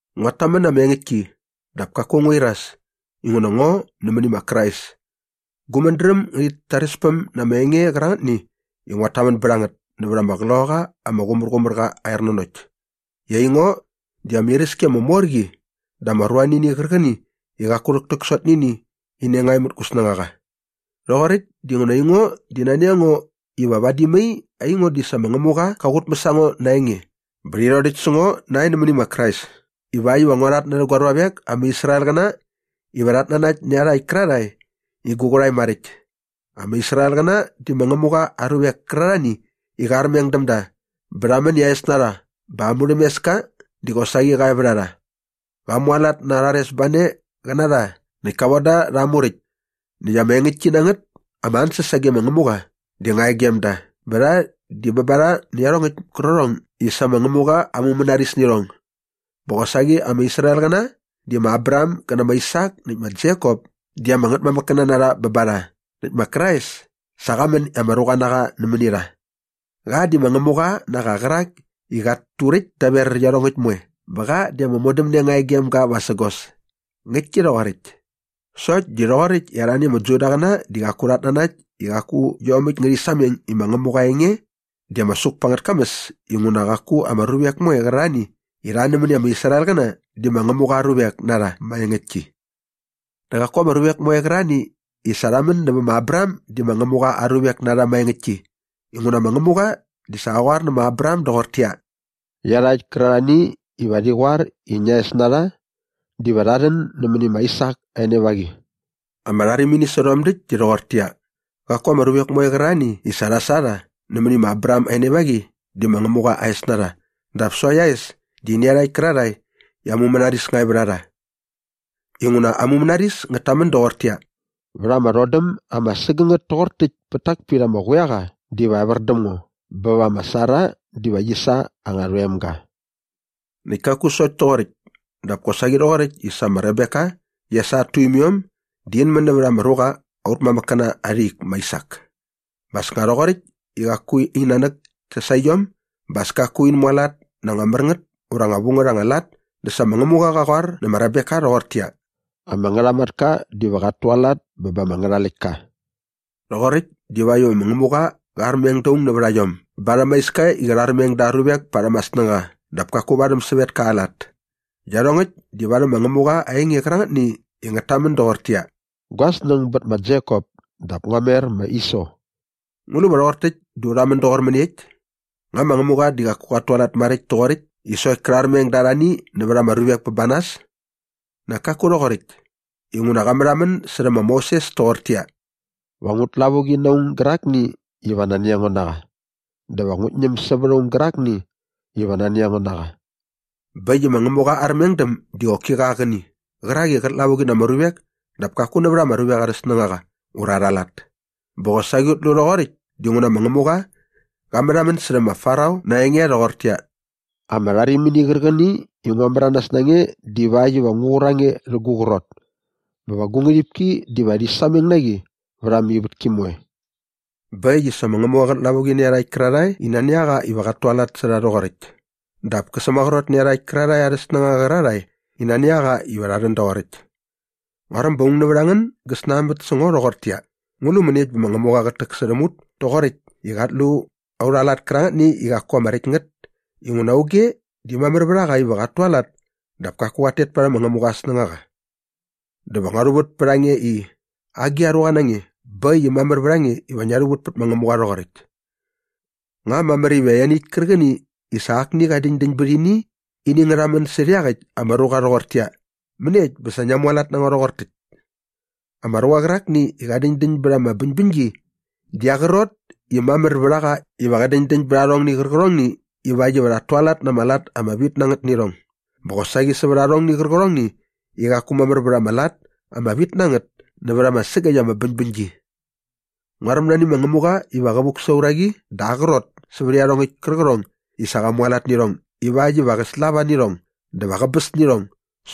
Nguat tamän na ama engäktki dap kaku ngu iras inguna ngo nämäni ma Krais. Gu mädräm ngärhit tarespäm na ama enge qärangätni i nguat tamän bät a ngät nävät ama Qloqaqa ama Qumärqumärqa aa ernanokt i aingo di ama iräski ama mor qi dä ama ruanini qärqäni i qaku rhäktäksot nä ini nga e mät gu snängaqa. Rhoqoräkt dinguna aingo di nani a ngo iva vadi mai aingo di sa ma Ngämuqa qa qutmäs a ngo na aa enge bä rhi rhodäkt sä ngo nae nämäni ma Krais ivakt iva ngua rhatnärhä gua ruavek ama Israelqäna iva rhat nanakt iarhakt kärarhae i gu qärhae maräkt. Ama Israelqäna di ma Ngämuqa aa ruvek kärarhani i qa armeng däm da bä rha män i aa es na rha bä aa murhämeska di qosaqi qa e vät a rha. Qa mualat na aa rharesbane qä na rha näkt ka von da rha aa Muräkt. Näkt ama engäktki na ngät ama ansäs sage ma Ngämuqa di nga e gem da bä rha di bä ba rha nä iarhongäkt kärqärhong i sa ma Ngämuqa aa mumänaris nä irhong. Bä qosaqi ama Israelqäna di ma Abraham gä nä ma Aisak näkt ma Jekop di ama ngätmamäkkäna na rha bä ba rha näkt ma Krais sa qa män i ama ruqa na qa nämäni rha. Qa di ma Ngämuqa na qa qärak i qat turäkt daver iarhongäkt moe bä qa di ama modämne nga e gem ga vasägos. Ngäktki rhoqoräkt. Sokt di rhoqoräkt i arhani ama Judaqäna di qaku rhat nanakt di qaku iomäkt ngärhi sameng i ma Ngämuqa aa enge di ama suk pa angät kamäs inguna qaku ama ruvek moe qärarhani i rha nämäni ama Israelqäna di ma Ngämuqa aa ruvek na rha maengäktki. Dä qaku ama ruvek moe qärarhani i sa rha män nävä ma Abraham di ma Ngämuqa aa ruvek na rha maengäktki inguna ma Ngämuqa di sa qa qoar nä ma Abraham doqortäqyia, “Iarhakt kärarhani iva rhi qoar i ngia es na rha diva rha rhän nämäni ma Aisak aa enevaqi.” Ama rharimini sä rhom däkt di rhoqortäqyia, qaku ama ruvek moe qärarhani i sa rha sa rha mäni ma Abraham aa enevaqi di ma Ngämuqa aa es na rha dap sokt aa es di nä iarhakt kärarhae i aa mumänaris nga e vät a rha. Inguna ama mumänaris ngät tamän doqortäqyia, “Vät ama rhodäm ama sägängät toqor täkt pät tak pit ama quiaqa diva evär däm ngo bä va ma Sara diva qi sa anga rhoemga.” Näkt kaku sokt toqoräkt dap kosaqi rhoqoräkt i sa ma Rebeka di qia sa at tuimiom di in män nävät ama ruqa aut mamäkkäna arha ik ma Aisak bä nga as toqoräkt i qaku in nanäk kia sa iom bä as kaku in mualat na anga mär ngät ura anga vu ngät anga lat dä sa ma Ngämuqa qa qoar nä ma Rebeka rhoqortäqyia, “Ama ngärhamatka diva qat tualat bä ba ama ngärhaläktka.” Rhoqoräkt divakt iva ma Ngämuqa qa armeng da aung nävät a iom barhäm aa iska i qä rharmeng da aa ruvek parhäm aa snängaqa dap kaku varhäm sävetka aa lat. Iarhongäkt di varhäm ma Ngämuqa aa enge qärangätni i ngät tamän doqortäqyia, “Gua snäng bät ma Jekop dap ngua mer ma Iso.” Ngu lu va rhoqor täkt dä u rhamän doqor mäniekt? Nga ma Ngämuqa di qaku qat tualat maräkt toqoräkt i sokt kä rharmeng da arhani nävät ama ruvek bä ba nas? Nak kaku rhoqoräkt! Inguna qa märhamän särhä ma Moses toqortäqyia, “Va ngut lavuqi na aung gärakni iva nani a ngo na qa dä va ngu ñäm sävät aung gärakni iva nani a ngo na qa.” Bä äkt i ma Ngämuqa aa armengdäm di qoki qa aa qäni qärak i qät lavuqi na ama ruvek dap kaku nävät ama ruvek arhä snängaqa ura arha lat. Bä qosaqi ut lu rhoqoräkt dinguna ma Ngämuqa qa märhamän särhä ma Farao na aa enge rhoqortäqyia, “Ama rharimini qärqäni i ngua märanas na nge divakt iva ngu qur a nge rhä gu qrot bä va gu ngärhipki diva rhi sameng na qi vät ama ivätki moe.” Bä äkt i sa ma Ngämuqa qät lavuqi nä iarhakt kärarhae i nani a qa iva qat tualat sä rha rhoqoräkt dap kä sämaqrot nä iarhakt kärarhae arhä snängaqa qärarhae i nani a qa iva rha rhän doqoräkt. Nguaräm ba aung nävät a ngän gä snanbät sä ngo rhoqortäqyia, “Ngu lu mäniekt bä ma Ngämuqa qät täksärhäm ut toqoräkt i qat lu aurha lat kärangätni i qaku ama räkt ngät inguna auge di mamär vät a qa iva qat tualat dap kaku qat tet parhäm ma Ngämuqa aa snängaqa?” Dä va ngua rhuvät pät a nge i, “Agi a ruqa na nge bä äkt i mamär iva ngia rhuvät pät ma Ngämuqa rhoqoräkt?” Nga mamär iva ianiäkt kärqäni i sa akni qa däñdäñ bät ini ngä rhamän särhä iaqäkt ama ruqa rhoqortäqyia, “Mäniekt bä sa ngia mualat na ngo rhoqor täkt?” Ama ruqa qärakni i qä däñdäñ bät ama bäñbäñgi di aa qrot i mamär vät a qa iva qä däñdäñ bät arhongni qärqärhongni ivakt iva rhat tualat na ama lat ama vit na ngät nä irhong bä qosaqi sävät arhongni qärqärhongni i qaku mamär vät ama lat ama vit na ngät nävät ama sägäkt ama bäñbäñgi. Nguaräm nani ma Ngämuqa iva qä vuk sa aa uraqi dä aa qrot sävät iarhongäkt kärqärhong i sa qa mualat nä irhong ivakt iva qä slava nä irhong dä va qäbäs nä irhong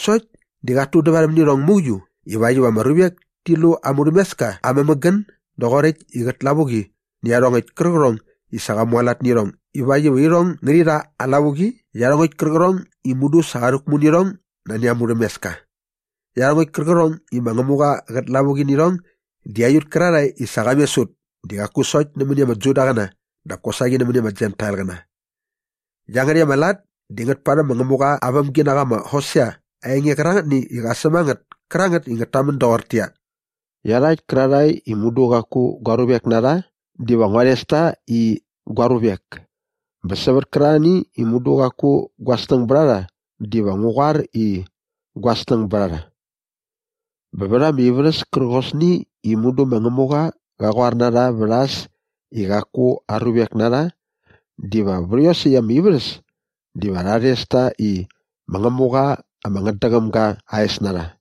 sokt di qat tudävarhäm nä irhong mauiu ivakt iva ama ruvek ti lu aa murhämeska aa mämägän doqoräkt i qät lavuqi nä iarhongäkt kärqärhong i sa qa mualat nä irhong ivakt iva irhong ngärhi rha aa lavuqi iarhongäkt kärqärhong i mudu sa qa rhäkmu nä irhong nani aa murhämeska. Iarhongäkt kärqärhong i ma Ngämuqa qät lavuqi nä irhong di aiut kärarhae i sa qa mes ut di qaku sokt nämäni ama Judaqäna dap kosaqi nämäni ama Jentailqäna. Iangärhäkt ama lat di ngät parhäm ma Ngämuqa aa vämginaqa ma Hosea aa enge qärangätni i qa säm a ngät kärangät i ngät tamän doqortäqyia, “Iarhakt kärarhae i mudu qaku gua ruvek na rha diva ngua rhes ta i, ‘Gua ruvek’ bä sävät kärarhani i mudu qaku gua snäng bät a rha diva ngu qoar i, ‘Gua snäng bät a rha.’” “Bä vät ama ivärhäs kärqosni i mudu ma Ngämuqa qa qoar na rha vät a äs i qaku aa ruvek na rha diva vät iosäkt ama ivärhäs diva rha rhes ta i, ‘Ma Ngämuqa ama ngätdäqäm ga aa es na rha.’”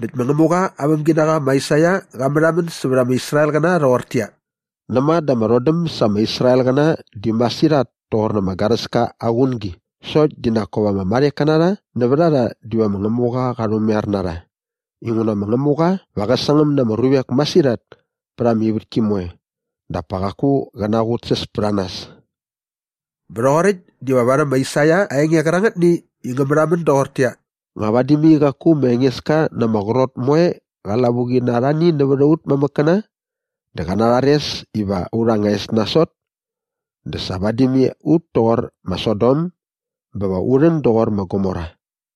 Näkt ma Ngämuqa aa vämginaqa ma Aisaia qa märhamän sävät ama Israelqäna rhoqortäqyia, “Näma dä ama rhodäm sa ama Israelqäna di masirhat toqor ama garäska aa qungi sokt di nak kop ama marheka na rha nävät a rha diva ma Ngämuqa qa rhumaiar na rha inguna ma Ngämuqa va qä sangäm na ama ruvek masirhat pät ama ivätki moe dap pa qaku qä naqutsäs pät a nas.” Bä rhoqoräkt diva varhäm ma Aisaia aa enge qärangätni i ngä märhamän doqortäqyia, “Nga vadi mai qaku ma Engeska na ama qrot moe qa lavuqi na arhani nävät aut mamäkkäna dä qä narhares iva aurha anga es nasot dä sa vadi mai ut toqor ma Sodom bä va u rhän doqor ma Gomora.”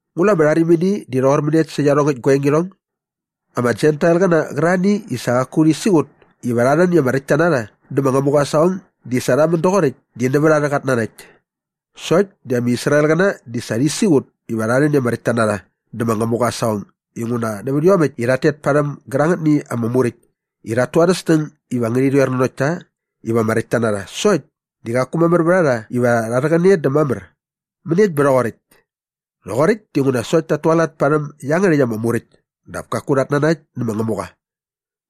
Ngu lu ama rharimini di rhoqor mäniekt sä iarhongäkt gua engirhong? Ama Jentailqäna qärarhani i sa qaku rhi siqut iva rha rhän i ama räktta na rha dä ma Ngämuqa aa saqong di sa rha män doqoräkt di nävät arhä qat nanakt. Sokt di ama Israelqäna di sa rhi siqut iva rha rhän i ama räktta na rha dä ma Ngämuqa aa saqong inguna nävät iomäkt iva rhat tet parhäm gärangätni ama Muräkt i rhat tu arhä snäng iva ngärhi rhoer nanokt ta iva ama räktta na rha sokt di qaku mamär vät a rha iva rha rhäqäne dä mamär. Mäniekt bä rhoqoräkt? Rhoqoräkt dinguna sokt tat tualat parhäm iangärhäkt ama Muräkt dap kaku rhat nanakt nä ma Ngämuqa.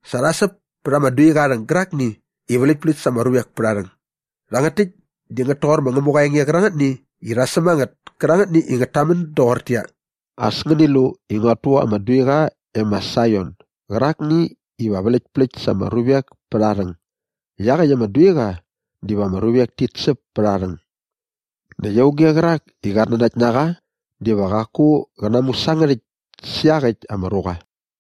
Sa rha säp pät ama duiqa aa rhäng gärakni i vläktpläkt sa ama ruvek pät aa rhäng. Rhangät täkt di ngät toqor ma Ngämuqa aa enge qärangätni i rha säm a ngät kärangät i ngät tamän doqortäqyia, “As ngäni lu i nguat tu ama duiqa e ma Saion gärakni iva vläktpläkt sa ama ruvek pät aa rhäng. Iaqäkt ama duiqa diva ama ruvek tit säp pät aa rhäng. Näkt auge qärak i qat nanakt na qa diva qaku qä namusangärhäkt sä iaqäkt ama ruqa.”